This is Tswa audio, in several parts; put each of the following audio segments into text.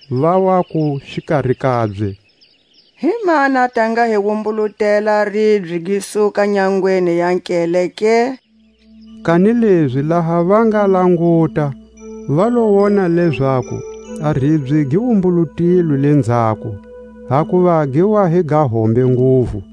Va waku xikari kabye: Himani a ta nga hi wumbulutela a ribye gi suka nyangweni ya nkele ke? Kanilezi laha va nga languta, va lo wona lezaku a ribye gi wumbulutilwe lenzhako; hakuva gi wa hi ga hombe nguvu.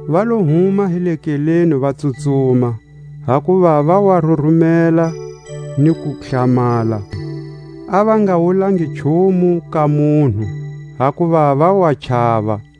Va lo huma hi le nkeleni va tsutsuma, hakuva ya wa rurumela ni ku hlamala; a va nga wulangi nchumu ka munhu, hakuva va wa chava.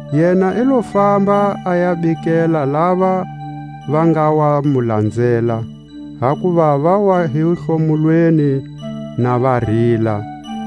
Yena i lo famba a ya bikela lava va nga wa mu lanzela, hakuva ya wa hi hlomulweni na va rila,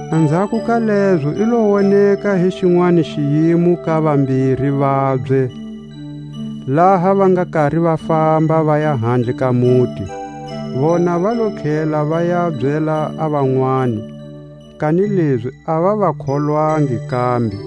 Anzhako ka lezo i lo woneka hi xinwani xiyimo ka vambiri vabye, laha va nga kari va famba vaya handle ka muti. Vona va lo tlhela va ya byela a vanwani, kanilezi a va va kholwangi kambe.